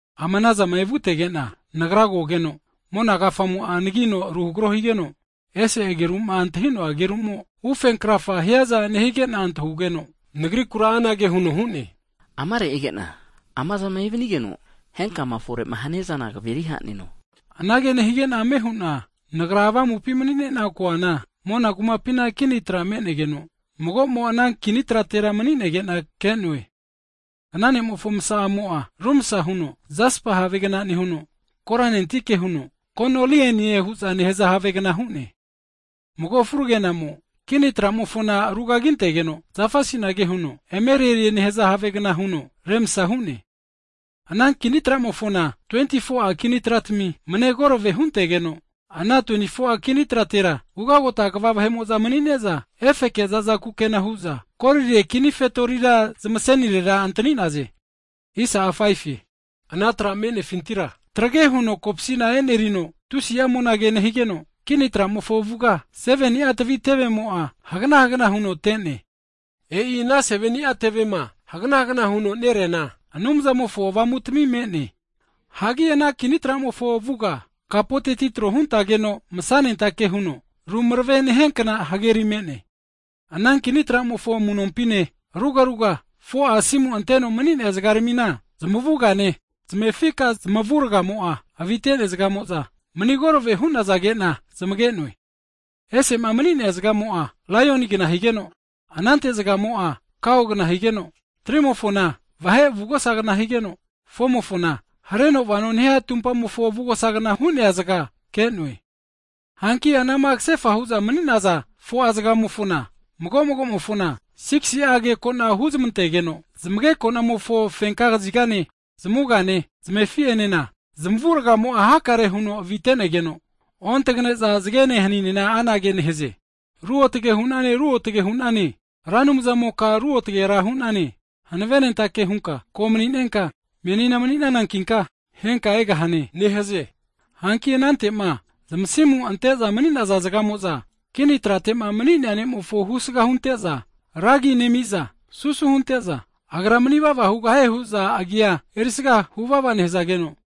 Ama anazama evutege'na, nagra kogeno, mona kafamo'a anagino ruhagro higeno, ese ageru'ma antahi'noa agerumo ufenkrafama hiaza nehige'na antahugeno, Nagrikura anage huno hu'ne, Amare ege'na, amazama evanigeno, henkama fore'ma hania zana kaveri haneno. Anage nehige'na ame hu'na nagra avamupi mani'ne'na koana, mona kumapina kini tra me'negeno, mago'mo ana kini tratera mani'nege'na ke'noe. Ana ne'mofo masa'amo'a rumsa huno jasapa havegna nehuno, koranentike huno konilienie hu'za nehaza havegna hu'ne. Mago furagena'mo kini tramofona rugagintegeno, zafa asinage huno emerelie nehaza havegna huno remsa hu'ne. Ana kini tramofona 24'a kini tratami manegorave huntegeno, ana 24'a kini tratera ugota kva vahe'mo'za mani'ne'za, efeke zaza kukena hu'za, golire kini fetori zamasenirera antani'naze. Ana tra'ma me'nefintira trage huno kopsina e'nerino, tusi'a monage nehigeno, kini tramofo avuga 7ni'a tavi tevemo'a hagana hagana huno te'ne. E'i ana 7ni'a tevema hagana hagana huno nereana, Anumzamofo 7ni'a Avamutami me'ne. Hagi ana kini tra'mofo avuga, kapoteti tro huntageno masanentake huno rumarave nehiankna hageri megeno, ana kini tramofo amu'nompine rugaruga, 4'a asimu anteno mani'nea zagaramina, zamavugane zamefika zamavurgamo'a avite'nea zagamo'za mani korave hu'nazage'na zamage'noe. Ese'ma mani'nea zagamo'a laionigna higeno, anante zagamo'a kaogna higeno, nampa 3zagamofona vahe avugosagna higeno, nampa 4zagamofona hareno vano nehia tumpamofo avugosagna hu'nea zaga ke'noe. Hanki anama kasefa hu'za mani'naza 4'a zagamofona, mago magomofona 6si'a agekona huzmantegeno, zamagekonamofo fenka kizigane, zamavugane zamefi'enena zamavurgamo'a hakare huno avitenege'za, ontagane'za zagene hanine anage nehaze, Ruotage hu'nane ruotage hunane, Ra Anumzamoka Ruotgera hu'nane, Hanavenentake hunka, Ko mani'nenka, menina mani'nanankinka, henka egahane hu'za nehaze. Hanki anantema zamasimu ante'za mani'naza zagamo'za, kini tratema mani'nea Ne'mofo husga hunte'za, ra agi nemi'za, susu hunte'za Agra manivava hugahie hu'za agia erisaga huvava nehazageno,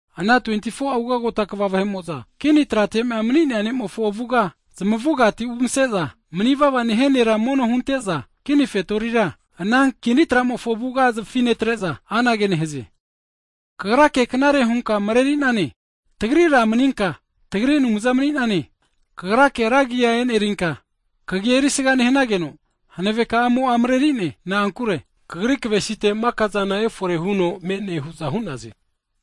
ana 24'a ugota kva vahe'mo'za, kini trate'ma mani'nea Ne'mofo avuga zmavugati zmarena omere'za umase'za, manivava nehia Nera mono hunente'za kini fetorira, ana kini tra'mofo avuga zafi netre'za, anage nehaze, Kagrake knare hunka mareri'nane, tagri Ra maninka, tagri Anumza mani'nane. Kagrake rankagia e'nerinka, kagia erisaga nehageno, hanavekamo'a marerinie. Na'ankure Kagri kavesite maka zana efore huno me'ne hu'za hu'naze.